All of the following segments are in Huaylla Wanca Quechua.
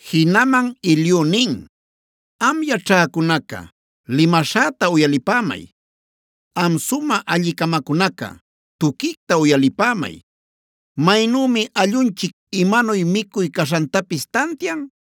Jinaman Eliu nin: “Am yaćhäcunaca limaśhäta uyalipämay; am sumä alli-camacunaca tuquicta uyalipämay. Maynümi allunchic imanuy micuy caśhantapis tantian,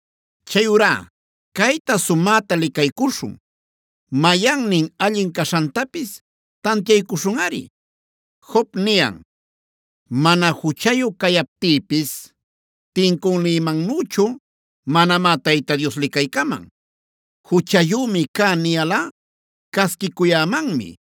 Chayurá cayta sumäta licaycuśhun; mayannin allin caśhantapis tantiaycuśhunꞌari. Job niyan: ‘Mana juchayu cayaptïpis tincünïmannüchu manamá Tayta Dios licaycaman. Juchayümi cä niyalꞌa casquicuyämanmi.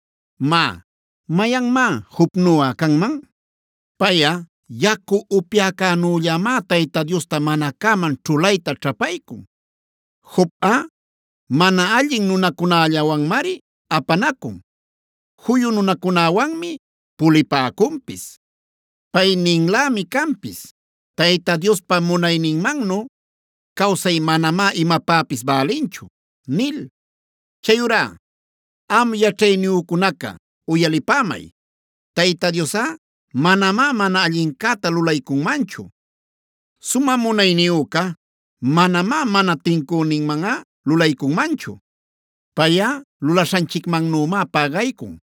“Má, ¿mayanmá Jobnuꞌa canman? Payꞌa yacu upyäcänüllamá Tayta Diosta mana cäman ćhulayta ćhapaycun. Jobꞌa mana allin nunacunällawanmari apanacun; juyu nunacunäwanmi pulipäcunpis. Pay ninlämi canpis: ‘Tayta Diospa munayninmannu cawsay manamá imapäpis bälinchu’ nil. “Chayurá am yaćhayniyücunaca uyalipämay: Tayta Diosꞌa manamá mana allincäta lulaycunmanchu; sumä munayniyüca manamá mana tincüninmanꞌa lulaycunmanchu. Payꞌa lulaśhanchicmannümá pägaycun;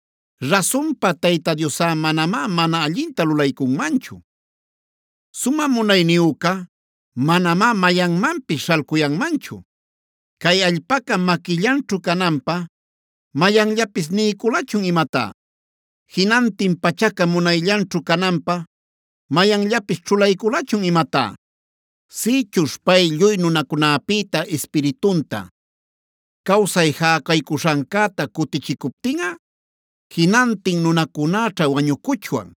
Rasunpa, Tayta Diosꞌa manamá mana allinta lulaycunmanchu; sumä munayniyüca manamá mayanmanpis śhalcuyanmanchu. ¿Cay allpaca maquillanćhu cananpä mayanllapis niyculachun imatá? ¿Jinantin pachaca munayllanćhu cananpä mayanllapis ćhulayculachun imatá? Sïchuśh pay lluy nunacunäpïta Ispiritunta, cawsay jäcaycuśhancäta cutichicuptinꞌa, jinantin nunacunäćha wañucuchwan;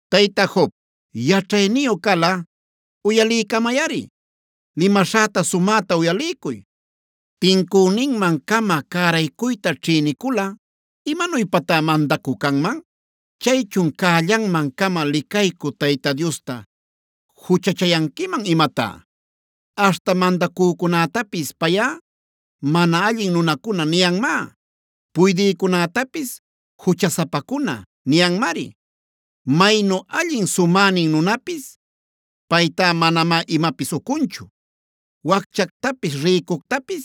“Tayta Job, yaćhayniyu calꞌa uyaliycamayꞌari; limaśhäta sumäta uyaliycuy. ¿Tincüninmancama cäraycuyta ćhïniculꞌa imanuypatá mandacü canman? ¿Chaychun cällanman-cama licaycü Tayta Diosta juchachayanquiman imatá? Aśhta mandacücunätapis payꞌa ‘mana allin nunacuna’ niyanmá; puydïcunätapis ‘juchasapacuna’ niyanmari. Maynu allin sumänin nunapis paytá manamá imapis ucunchu. Wacchactapis rïcuctapis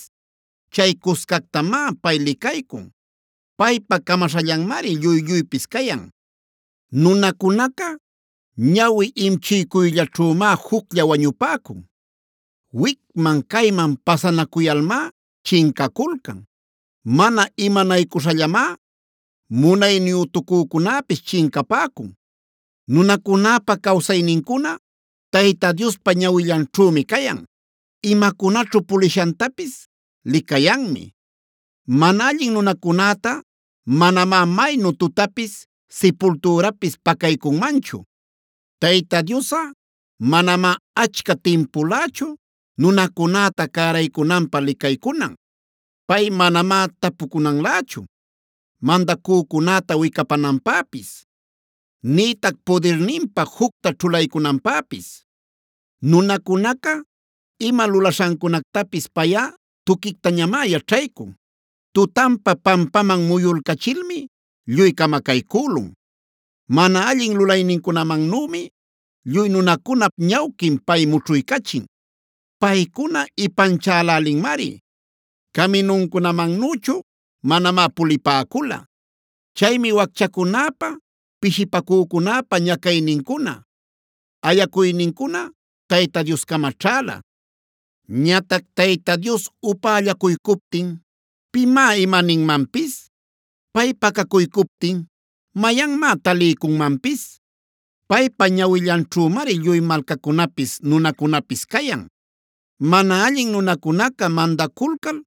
chay cuscactamá pay licaycun. Paypa camaśhallanmari lluy-lluypis cayan. Nunacunaca ñawi imchiycuyllaćhümá juclla wañupäcun. Wicman-cayman pasanacuyalmá chincaculcan; mana imanaycuśhallamá munayniyütucücunäpis chincapäcun. “Nunacunäpa cawsaynincuna Tayta Diospa ñawillanćhümi cayan; imacunaćhu pulishantapis licayanmi. Mana allin nunacunäta manamá maynu tutapis, sipultürapis pacaycunmanchu. Tayta Diosꞌa manamá achca timpulächu nunacunäta cäraycunanpä licaycunan. Pay manamá tapucunanlächu mandacücunäta wicapananpäpis; nïtac pudirninpä jucta ćhulaycunanpäpis. Nunacunaca ima lulaśhancunactapis payꞌa tuquictañamá yaćhaycun. Tutanpa pampaman muyulcachilmi lluy camacaycülun. Mana allin lulaynincunamannümi, lluy nunacunap ñawquin pay mućhuycachin. Paycuna ipanchälälinmari, caminuncunamannüchu manamá pulipäcula. Chaymi wacchacunäpa, pishipacücunäpa ñacaynincuna ayacuynincuna Tayta Dioscama ćhäla. Ñatac Tayta Dios upällacuycuptin ¿pimá imaninmanpis? Pay pacacuycuptin ¿mayanmá taliycunmanpis? Paypa ñawillanćhümari lluy malcacunapis nunacunapis cayan, mana allin nunacunaca mandaculcal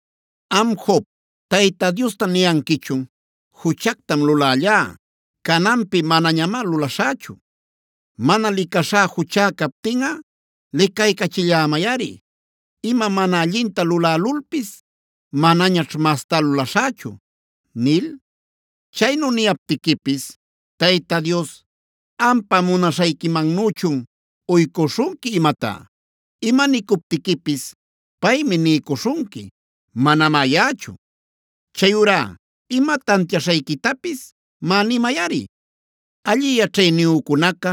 “Am Job, Tayta Diosta niyanquichun: ‘Juchactam lulällá; cananpi manañamá luläśhächu. Mana licaśhá juchá captinꞌa licaycachillämayꞌari. Ima mana allinta lulälulpis manañaćh mastá lulaśhächu’ nil. Chaynu niyaptiquipis Tayta Dios ¿ampa munaśhayquimannüchun uycuśhunqui imatá? Ima nicuptiquipis paymi niycuśhunqui, manamá yaꞌachu. Chayurá ima tantiaśhayquitapis má nimayꞌari. “Alli yaćhayniyücunaca,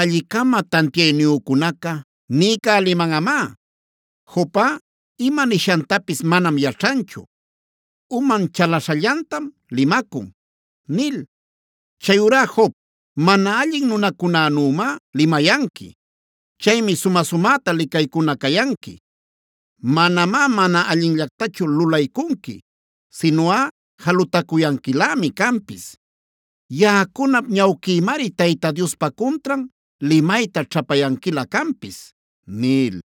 alli-cama tantiayniyücunaca niycälimanꞌamá: ‘Jobꞌa, ima nishantapis manam yaćhanchu; uman chalaśhallantam limacun’ nil. Chayurá Job, mana allin nunacunänümá limayanqui. Chaymi sumä-sumäta licaycuna cayanqui. Manamá mana allinllactachu lulaycunqui, sinuꞌa jalutacuyanquilämi canpis. Yaꞌacunap ñawquïmari Tayta Diospa cuntran limayta ćhapayanquilä canpis” nil.